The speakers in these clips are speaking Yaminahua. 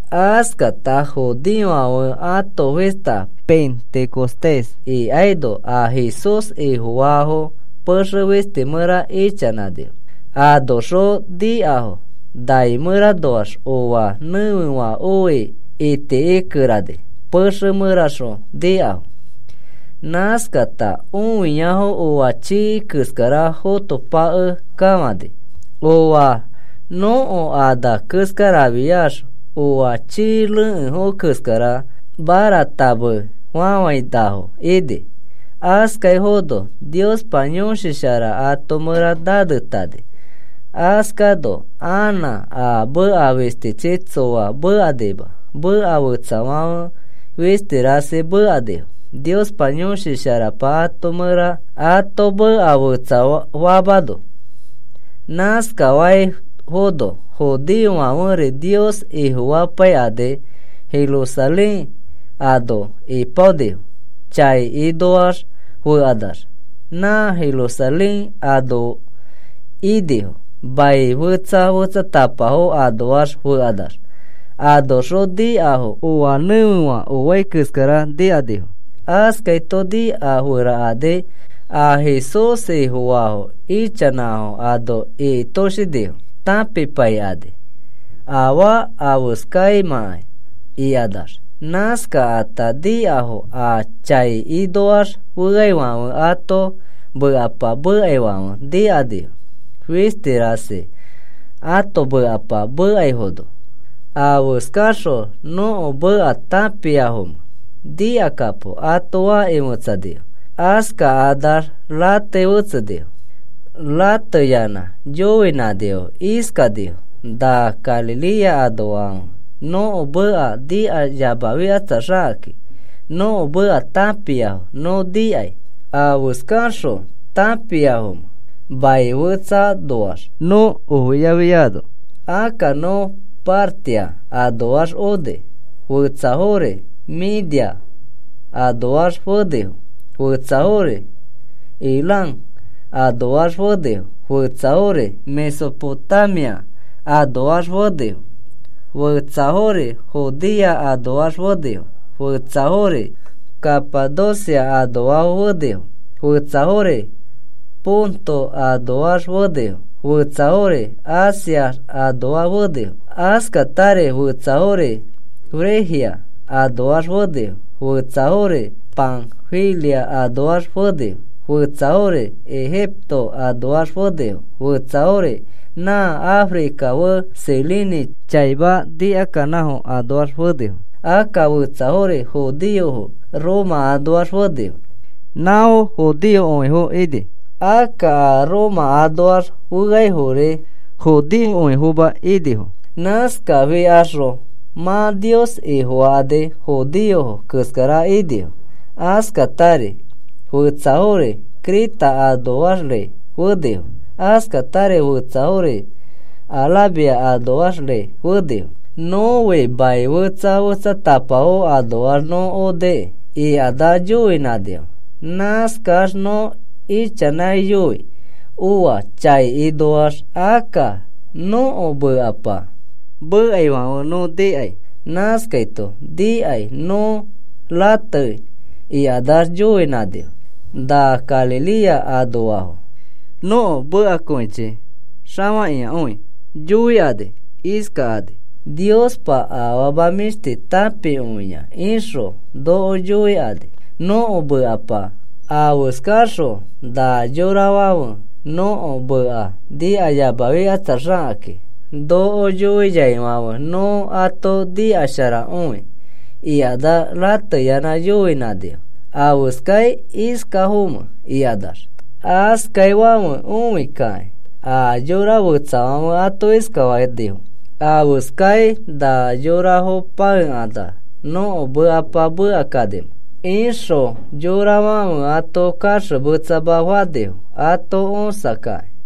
Askata judeofãfe ãto fista Pentecostés ikaino a Jesús Ifofaafo pexe fisti mẽra ichanãnifo. Anoxõ nikafo nai mẽranoax oa nẽfefã oi itikikerani pexe mẽraxõ nikafo. Nãskata õiafo oa chii keskara fotopakekafãni. Oa nõko ana keskarafiax oa chii rekẽfo keskara maratamefafãinafo ini. Askaifono Niospa Yõshi Shara ato mẽra nanetani. Askaino anã a meka fistichi tsoa mekanima. Meka fetsafãfe fisti rasi mekanifo Niospa Yõshi Sharapa ato meka fetsafamano. Nãskaifono judeofãferi Nios Ifofapaikani Jerusalén ano ipaonifo, chai inoax fekanax. Nã Jerusalén ano inifo mai fetsa fetsatapafo anoax fekanax. Anoxõ nikafo oa nẽfefã oai keskara nikanifo. Askaito nikaferakani a Jesús Ifofaafo ichanãfo ano ikitoshinifo. Tãpipaikani afaa afeskaimãkai ikanax. Nãskata nikafo a chai inoax feafãfe ãto mekapa mekaifãfe nikanifo, fisti rasi ãto mekapa mekaifono. “¿Afeskaxõ nõko meka tãpiafomẽ? Nikakapo,” ato fakĩ fetsanifo. Askakanax ratei fetsenifo. Rateyanã yoinãnifo. Iskanifo: “Na Galilea anoafãfe nõko meka nikayamafikatsaxakakĩ nõko meka tãpiafo nõ nikai. ¿Afeskaxõ tãpiafomẽ mai fetsanoax nõ ofiafiano? Akka nõ Partia anoax oni. Fetsafori Media anoax fenifo. Fetsafori Elam anoax fenifo. Fetsafori Mesopotamia anoax fenifo. Fetsafori Judea anoax fenifo. Fetsafori Capadocia anoax fenifo. Fetsafori Ponto anoax fenifo. Fetsafori Asia anoax fenifo. Askatari fetsafori Frigia anoax fenifo. Fetsafori Panfilia anoax fenifo. Fetsafori Egipto anoax fenifo. Fetsafori nã Africa fe, Cirene chaima nikakanãfo anoax fenifo. Akka fetsafori judeofo Roma anoax fenifo; nãfo judeokõifo ini. Akka a Roma anoax feafori judeokõifoma inifo. Nãskafikaxõ mã Nios Ifofakani judeofo keskara inifo. Askatari fetsafori Creta anoaxri fenifo. Askatari fetsafori Arabia anoaxri fenifo. Nõfi mai fetsa fetsatapafo anoax nõ onikĩ,” ikanax yoinãnifo. “Nãskax nõ ichanãiyoi oa chai inoax, akka nõko mekapa mekaifãfe nõ nikai. Nãskaito nikai nõ ratei,” ikanax yoinãnifo. “Na Galilea anoafo nõko mekakõichi xafakĩakõi yoikani iskakani: ‘Niospa afama mĩshti tãpikõia,’ ixõ noko yoikani nõko mekapa. Afeskaxõ na yorafãfe nõko meka nikayamafikatsaxakakĩ noko yoiaifãfe nõ ato nikasharakõi,” ikanax rateyanã yoinãnifo: “¿Afeskai iskafomẽ?” ikanax. Askaifãfe õikakĩ a yora fetsafãfe ato iskafanifo: “¿Afeskai na yorafo pãekanax nõko mekapa mekakanimẽ?” ixõ yorafãfe ato kaxemetsama fanifo ato õsakakĩ.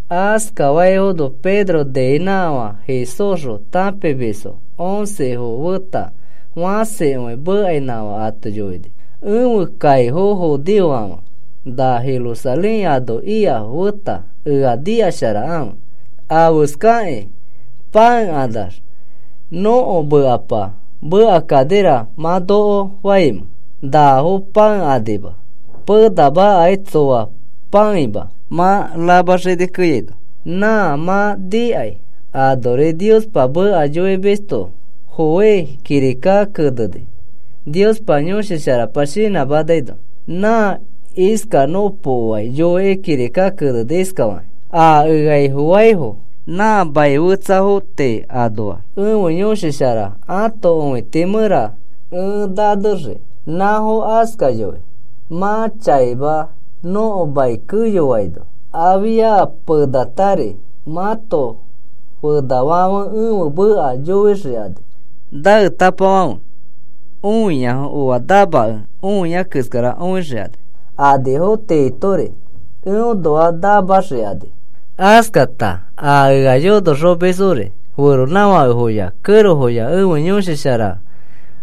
Askaifono Pedro niinãkafã Jesúsxõ tãpimisfo oncefo feta fãsikõi mekainãkafã ato yoini: “Ẽfe kaifo judeofofãfe na Jerusalén ano ikafo feta, ea nikasharakãfe. ¿Afeskakĩ pãekanax nõko mekapa mekakanira, mã noko faimẽ? Nafo pãekanima. Penamakai tsoa pãeima mã rama xini keyaino. Nã mã nikai anori Niospa meka yoimisto Joel kirika keneni Niospa Yõshi Sharapa shinãmanaino. Nã iskanõpokoai yoikĩ kirika keneni iskafakĩ: A ea Ifofaifo nã maniafo tii anoa ẽfe Yõshi Shara ãto õiti mẽra ẽ nanexii. Nãfo askayoi mã chaima nõko mai keyoaino. Afia penatari mãto fenafãfe ẽfe meka yoixikani. Naetapafãfe õiafo oa namakẽ õia keskara õixikani. Anifo tiitori eõnoa namaxikani. Askata a ea yonoxomisfori feronãfakefoya kẽrofoya ẽfe Yõshi Shara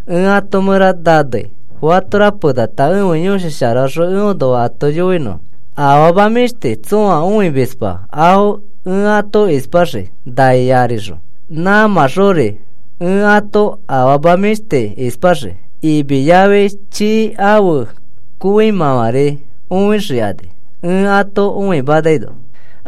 ẽ ato mẽra nanei fatora penata ẽfe Yõshi Sharaõxõ eõnoa ato yoinõfo. Afama mĩshti tsõa õimisma afo ẽ ato ispaxii nai arixõ, nãmãxori ẽ ato afama mĩshti ispaxii. Imi yafi chii ãfe kõimãfãri õixikani ẽ ato õimanaino.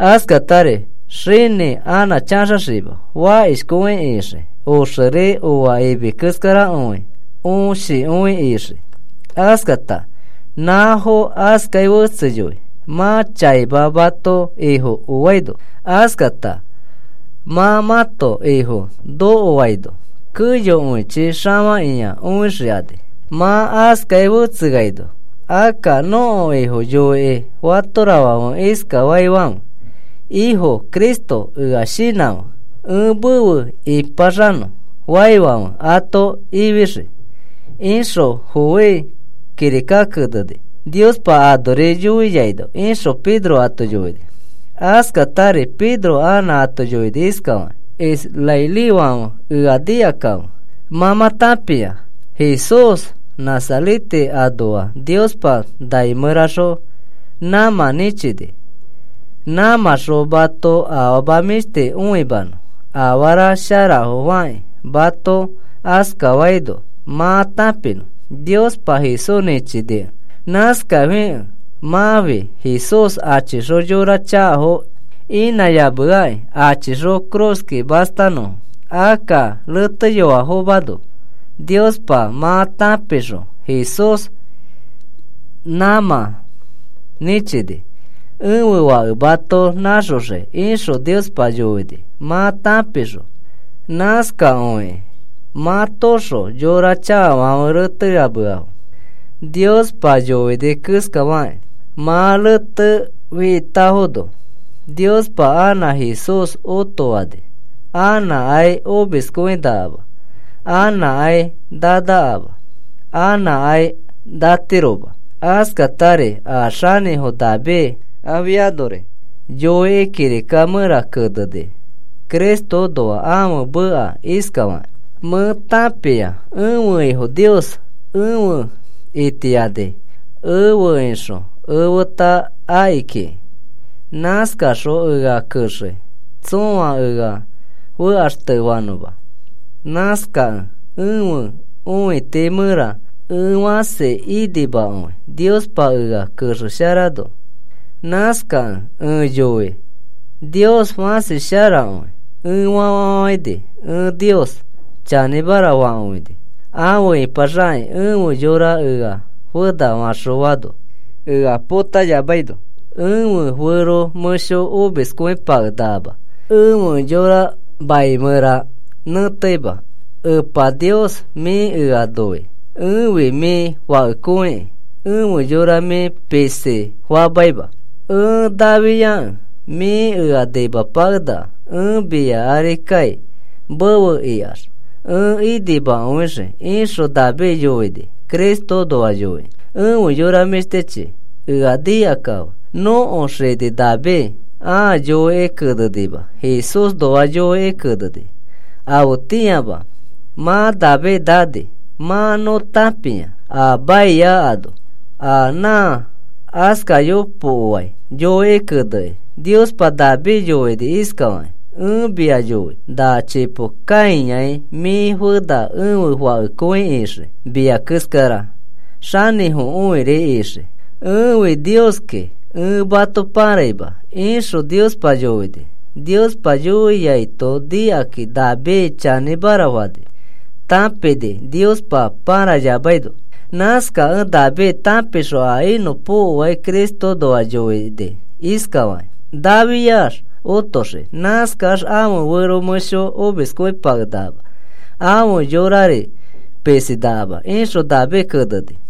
Askatari xinĩ anã chaxaxima, fakishkõi ixii. Oxeri oa imi keskarakõi õshikõi ixii. Askata nãfo askai fetseyoi mã chaima mãto Ifo oaino. Askata mã mãto Ifo nokokõiaino keyokõichi xafakĩa õixikani. Mã askai fetseaino akka nõko Ifo yoikĩ fatorafãfe iskafaifãfe: ‘Ifo Cristo, ea shinãfe, ẽ mefe ipaxanõ,’ faifãfe ato ifixii, ixõ Joel kirika keneni Niospa anori yoiaino,” ixõ Pedro ato yoini. Askatari Pedro anã ato yoini iskafakĩ: “Israelifãfe, ea nikakãfe. Mã mã tãpia Jesús Nazarete anoa Niospa nai mẽraxõ nãmã nĩchini, nãmãxõ mato afama mĩshti õimanõ afara sharafo fakĩ. Mato askafaino mã tãpinõ Niospa Jesús nĩchinikẽ. Nãskafikẽ mãfi Jesús achixõ yora chakafo inãyameaki achixõ cruzki mastanõfo. Akka reteyoafomano Niospa mã tãpixõ Jesús nãmã nĩchini: ‘Ẽfe Fãke mato nãxoxii,’ ixõ Niospa yoini mã tãpixõ. Nãskakõikĩ mãtoõxõ yora chakafãfe reteyameafo Niospa yoini keskafakĩ. Mã retefitafono Niospa anã Jesús otofani. Anãkai omiskõinakama. Anãkai nanakama. Anãkai natiroma. Askatari a xanĩfo David afianori yoikĩ kirika mẽra keneni Cristoõnoa ãfe meka iskafakĩ: Mẽ tãpia ẽfe Ifo Nios efe itiani. Efe ixõ efeta aki kiki. Nãskaxõ ea kexei tsõa ea fekaxtefanõma. Nãskakẽ ẽfe õiti mẽra ẽ fãsi inimakõi Niospa ea kexesharaino. Nãskakẽ ẽ yoikĩ: ‘Nios fãsi sharakõi,’ ẽ fafafafãini. Ẽ Nios chanĩmara fakõini afe ipaxakĩ ẽfe yora ea fena faxõano. Ea potayamaino ẽfe fero mẽsho omiskõipakenakama. Ẽfe yora mai mẽra nẽteima. Epa Niosi, mĩ ea noi. Ẽfi mĩ fakekõikĩ, ẽfe yora mĩ pisi famaima. Ẽ nafiakẽ mĩ ea nimapakenaka. Ẽ mia ari kai, mefe ikax ẽ inimakõixii, ixõ David yoini Cristoõnoa yoikĩ. “Efe yora mĩshtichi, ea nikakãfe. Nõko xini David ãa yoikĩ kenenima. Jesúsnoa yoikĩ keneni. Afetĩama mã David nani. Mã nõ tãpia a maia ano. A nã askanõpokoai yoikĩ keneni. Niospa David yoini iskafakĩ: ‘Ẽ mia yoi na chipo kãiyai mĩ fena ẽfe Fakekõi ixii. Mia keskara xanĩfokõiri ixii. Ẽfi Nioskĩ. Ẽ mato pãraima,’ ixõ Niospa yoini. Niospa yoiaito nikakĩ David chanĩmara fani, tãpini Niospa pãrayamaino. Nãskakẽ David tãpixõ a inõpokoai Cristoõnoa yoini iskafakĩ: Nafiax otoxii. Nãskax ãfe fero mẽsho omiskõipakenakama, ãfe yorari pisinakama, ixõ David keneni.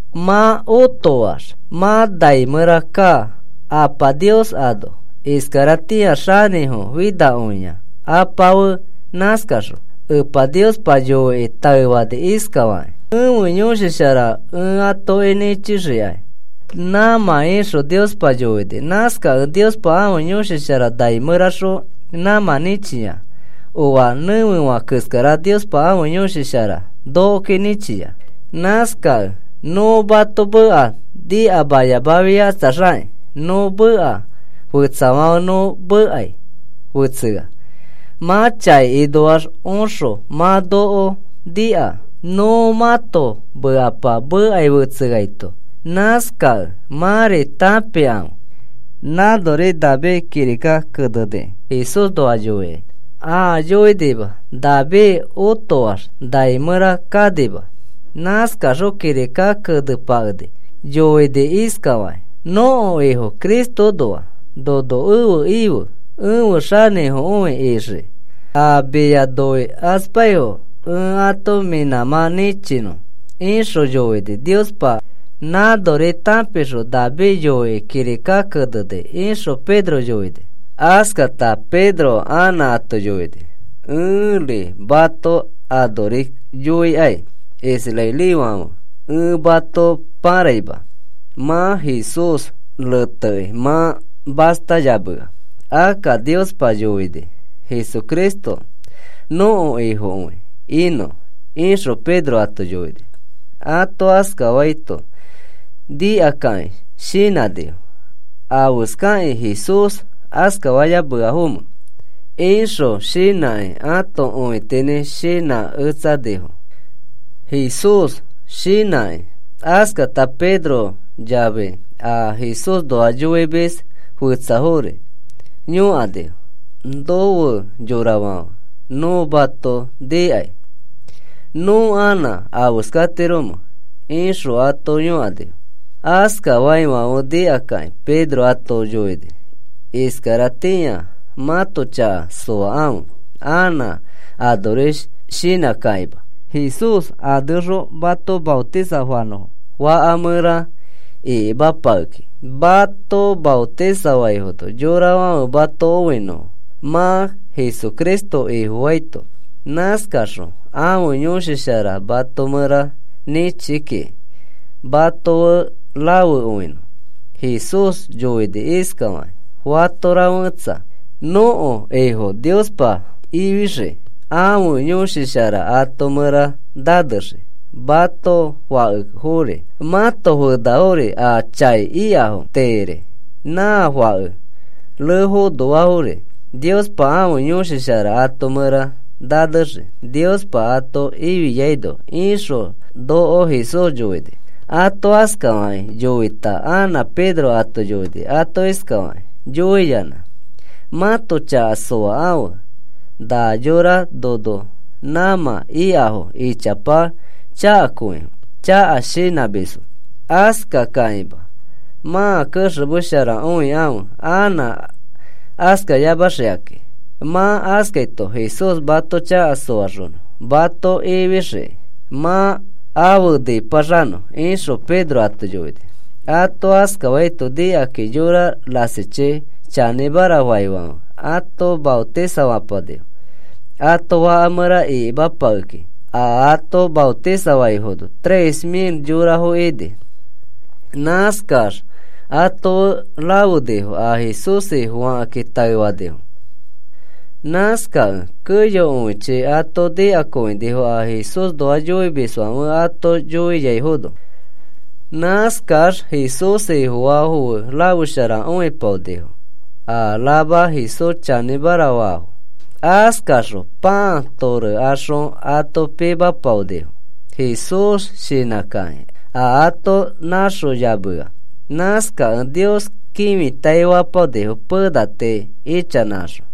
Mã otoax mã nai mẽra kaa Apa Nios ano. Iskaratĩa xanĩfo finakõia Apa fe. Nãskaxõ Epa Niospa yoikĩ taefani iskafakĩ: ‘Ẽfe Yõshi Shara ẽ atoki nĩchixikai nãmã,’ ixõ Niospa yoini. Nãskakẽ Niospa ãfe Yõshi Shara nai mẽraxõ nãmã nĩchia. Oa nẽfefã keskara Niospa ãfe Yõshi Shara nokoki nĩchia. Nãskakẽ nõ mãto meka nikayamafikatsaxakĩ nõ meka fetsafãfe nõ mekai fetsea. Mã chai inoax oxõ mã noko nika, nõ mãto mekapa mekai fetseaito. Nãskakẽ mãri tãpikãfe, nãnori David kirika kenenikĩ Jesúsnoa yoikĩ. Ãa yoinima. David otoax nai mẽra kanima. Nãskaxõ kirika kenepakekĩ yoini iskafakĩ nõko Ifo Cristoõnoa: Nono efe ife, efe xanĩfokõi ixiki. A mia noikaspaifo ẽ ato mĩ nãmã nĩchinõ, ixõ yoini Niospa. Nãnori tãpixõ David yoikĩ kirika keneni,” ixõ Pedro yoini. Askata Pedro anã ato yoini: “Ẽri mato anori yoikai, israelifãfe, ẽ mato pãraima. Mã Jesús retekĩ mã mastayamea. Akka Niospa yoini Jesucristo nõko Ifokõi inõ,” ixõ Pedro ato yoini. Ato askafaito nikakakĩ shinãnifo: “¿Afeskakĩ Jesús askafayameafomẽ?” ixõ shinãkĩ ato õitinĩ shinãketsanifo, Jesús shinãkakĩ. Askata Pedro yafi a Jesúsnoa yoimis fetsafori yõkanifo: “No fe yorafãfe, nõ mato nikai. ¿Nõ anã afeskatiromẽ?” ixõ ato yõkanifo. Askafaifãfe nikakĩ Pedro ato yoini: “Iskaratĩa mãto chaka soakãfe anã anori shinãkakĩma. Jesús aneõxõ mato maotisafanõfo, faka mẽra ikimapakekĩ. Mato maotisafaifono yorafãfe mato õinõfo mã Jesucristo Ifofaito. Nãskaxõ ãfe Yõshi Shara mato mẽra nĩchi kikĩ mato fe rafekõinõ. Jesús yoini iskafakĩ: ‘Fatora fetsa nõko Ifo Niospa ifixii ãfe Yõshi Shara ato mẽra nanexii. Mãto fakefori, mãto fenafori a chai ikafo tiiri nã fake refonoafori Niospa ãfe Yõshi Shara ato mẽra nanexii Niospa ato ifiano,’ ixõ noko Jesús yoini.” Ato askafakĩ yoita anã Pedro ato yoini ato iskafakĩ yoiyanã: “Mãto chaka soakãfe. Na yora nono nãmã ikafo ichapa chakakõifo chaka shinãmisfo. Askakakĩma mãa kexemesharakõikãfe anã askayamaxikakĩ. Mã askaito Jesús mato chaka soaxonõ mato ifixiki mã afe ĩpaxanõ,” ixõ Pedro ato yoini. Ato askafaito nikakakĩ yora rasichi chanĩmara faifãfe, ato maotisafapanifo, ato faka mẽra ikimapakekakĩ. A ato maotisafaifo tres mil yorafo ini. Nãskax ato fe rafenifo a Jesús Ifofakakĩ taefanifo fe. Nãskakẽ keyokõichi ato nikakõinifo a Jesúsnoa yoimisfãfe ato yoiaifono. Nãskax Jesús Ifofaafo fe rafesharakõipaonifo, a rama Jesús chanĩmara faifo. Askaxõ pãa torekaxõ ato pikĩpaonifo Jesús shinã kakĩ, a ato nãxoyamea. Nãskakẽ Nios kĩfitai fapaonifo pena tii ichanãkaxõ.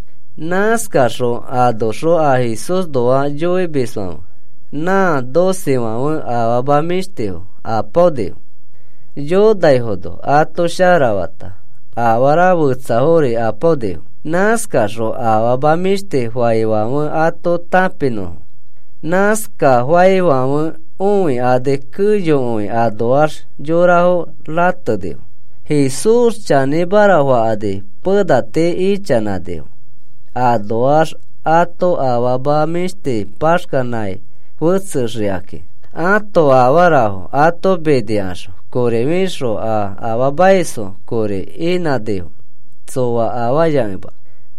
Nãskaxõ anoxõ a Jesúsnoa yoimisfãfe, nã docefãfe, afama mĩshtifo apaonifo, yonaifono ato sharafata, afara fetsafori apaonifo, nãskaxõ afama mĩshti faifãfe ato tãpinõfo. Nãskafaifãfe õikani keyokõi anoax yorafo ratenifo. Jesús chanĩmara fakani pena tii ichanãnifo. Anoax ãto afama mĩshti paxkanãi fetsexikakĩ. Ãto afarafo ato minikaxõ kori fixõ, a afaamaisfo kori inãnifo tsoa afayakẽma.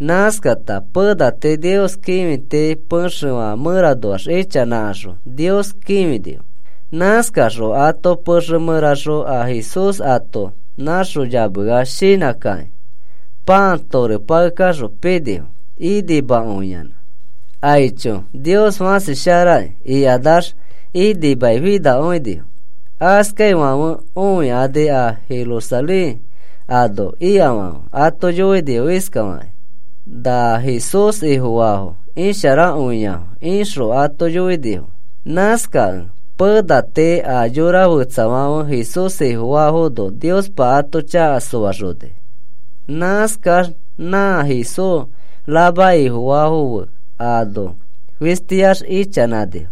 Nãskata pena tii Nios kĩfiti pexefã mẽranoax ichanãkaxõ Nios kĩfinifo. Nãskaxõ ãto pexe mẽraxõ a Jesús ato nãxoyamea shinãkakĩ pãa torepakexõ pinifo inimakõiyanã. “Aicho, Nios fãsi sharaki,” ikanax inimai finakõinifo. Askaifãfe õikani a Jerusalén ano ikafãfe ato yoinifo iskafakakĩ: “Na Jesús Ifofaafo isharakõiafo,” ixõ ato yoinifo. Nãskakẽ pena tii a yora fetsafãferi Jesús Ifofaifono Niospa ato chaka soaxoni. Nãskax nã Jesús rama Ifofaifo fe ano fistiax ichanãnifo,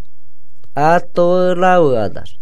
ato fe rafekanax.